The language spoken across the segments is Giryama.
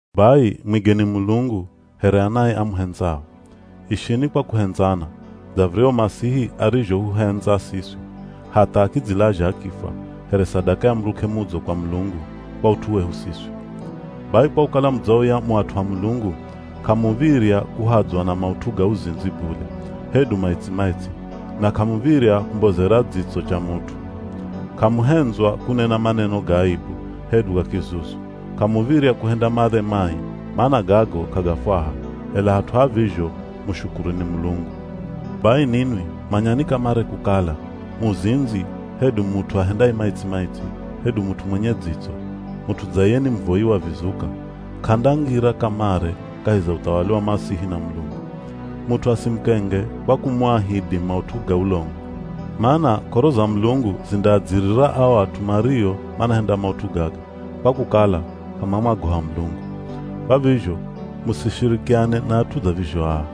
Bai mwigeni Mulungu, here anae amuhendzao. Ishini kwa kuhendzana, dza viryahu Masihi arizhohuhendza siswi, hatha akidzilazha akifwa, here sadaka ya muruk'e mudzo kwa Mulungu kwa ut'u wehu siswi. Bai kwa kukala mudzauya mu at'u a Mulungu, k'amuv̱irya kuhadzwa na maut'u ga uzindzi bule, hedu maitsi-maitsi, na k'amuv̱irya kumbozera dzitso cha mut'u. K'amuhendzwa kunena maneno ga aibu, hedu ga kizuzu, k'amuv̱irya kuhenda madhe mai, mana gago k'agafwaha, ela hat'u ha vizho mushukuruni Mulungu. Bai ninwi manyani kamare kukala, muzindzi, hedu mut'u ahendaye maitsi-maitsi, hedu mut'u mwenye dzitso (mut'u dza iye ni muvoyi wa vizuka), k'andangira kamare kahi za uthawali wa Masihi na Mulungu. Mut'u asimukenge kwa kumuahidhi maut'u ga ulongo, mana k'oro za Mulungu zindaadzirira ao at'u mario manahenda maut'u gaga, kwa kukala k'amamwagoha Mulungu. Kwa vizho musishirikiane na at'u dza vizho aa.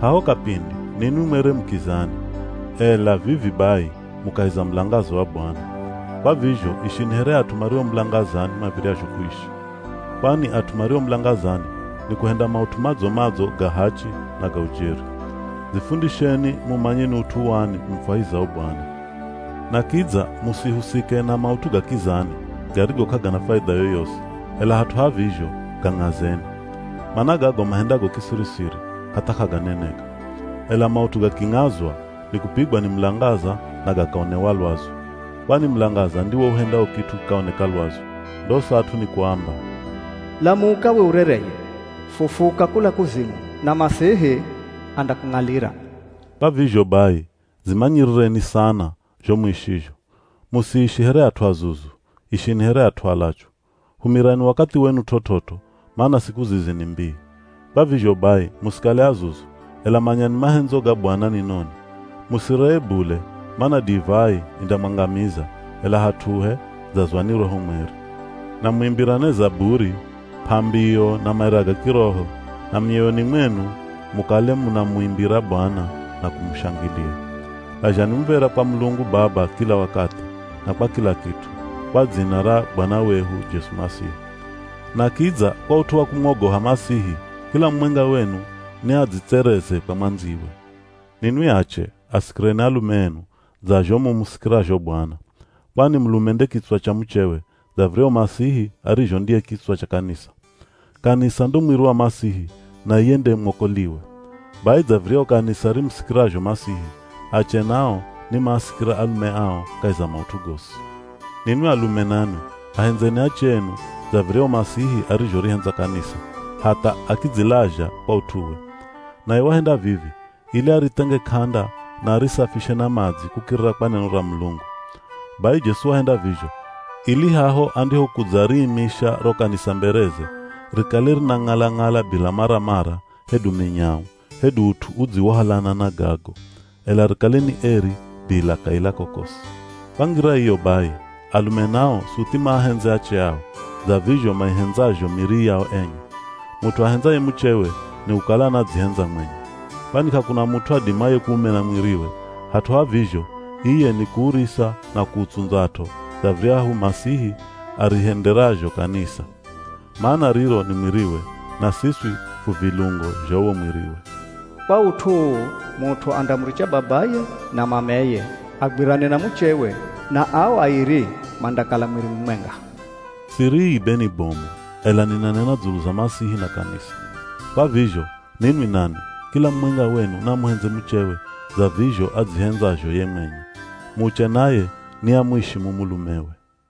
Haho kapindi ninwi mwere mu kizani, ela vivi bai mu kahi za mulangaza wa Bwana, kwa vizho ishini here at'u mario mulangazani mav̱iryazho kuishi. Kwani at'u mario mulangazani ni kuhenda maut'u madzo-madzo, ga hachi na ga ujeri. Dzifundisheni mumanye ni ut'u wani umufwahizao Bwana. Na kidza musihusike na maut'u ga kizani, garigo k'agana faidha yoyosi, ela hat'u ha vizho gang'azeni. Mana gago mahendago kisiri-siri, hatha k'aganeneka. Ela maut'u gaking'azwa, nikupigwa ni mulangaza na gakaonewa lwazu. Kwani mulangaza ndiwo uhendao kit'u kikaoneka lwazu. Ndosa at'u ni kuamba, “Lamuka we urereye, fufuka kula kuzimu, na Masihi andakung'alira.” Kwa vizho bai, dzimanyirireni sana zho muishizho. Musiishi here at'u azuzu, ishini here at'u alachu. Humirani wakathi wenu t'ot'ot'o, mana siku zizi ni mbii. Kwa vizho bai musikale azuzu, ela manyani mahendzo ga Bwana ni noni. Musiree bule, mana divai indamwangamiza, ela hat'uhe, dzazwani Roho Mweri, na muimbirane zaburi, p'ambiyo na maira ga kiroho, na mioyoni mwenu mukale munamuimbira Bwana na kumushangilia. Lazhani muv̱era kwa Mulungu Baba kila wakathi, na kwa kila kit'u, kwa dzina ra Bwana wehu Jesu Masihi. Na kidza kwa ut'u wa kumwogoha Masihi, kila mumwenga wenu ni adzitsereze kwa mwandziwe. Ninwi ache, asikireni alume enu, dza zho mumusikirazho Bwana. Kwani mulume nde kitswa cha muchewe, dza viryahu Masihi arizho ndiye kitswa cha kanisa. Kanisa ndo mwiri wa Masihi na iye nde mwokoliwe. Bai dza viryahu kanisa rimusikirazho Masihi, ache nao ni maasikire alume ao kahi za maut'u gosi. Ninwi alume nanwi, ahendzeni ache enu, dza viryahu Masihi arizhorihendza kanisa, hatha akidzilazha kwa ut'uwe. Naye wahenda vivi ili arithenge k'anda na arisafishe na madzi kukirira kwa neno ra Mulungu. Bai Jesu wahenda vizho, ili haho andihokudzariimisha ro kanisa mbereze, rikale rinang'ala-ng'ala bila maramara, hedu minyau, hedu ut'u udziwohalana na gago. Ela rikale ni eri bila kaila kokosi. Kwa ngira iyo bai, alume nao suthi maahendze ache ao, dza vizho maihendzazho miri yao enye. Mut'u ahendzaye muchewe, nikukala anadzihendza mwenye. Kwani k'akuna mut'u adimaye kuumena mwiriwe, hat'u ha vizho iye ni kuurisa na kuutsundzat'o, dza viryahu Masihi arihenderazho Kanisa. Mana riro ni mwiriwe, na siswi fu vilungo zha uwo mwiriwe. “Kwa ut'u uu mut'u andamuricha babaye na mameye agwirane na muchewe, na ao airi mandakala mwiri mumwenga.” Siri ii be ni bomu, ela ninanena dzulu za Masihi na Kanisa. Kwa vizho, ninwi nanwi, kila mumwenga wenu naamuhendze muchewe dza vizho adzihendzazho ye mwenye. Muche naye niamuishimu mulumewe.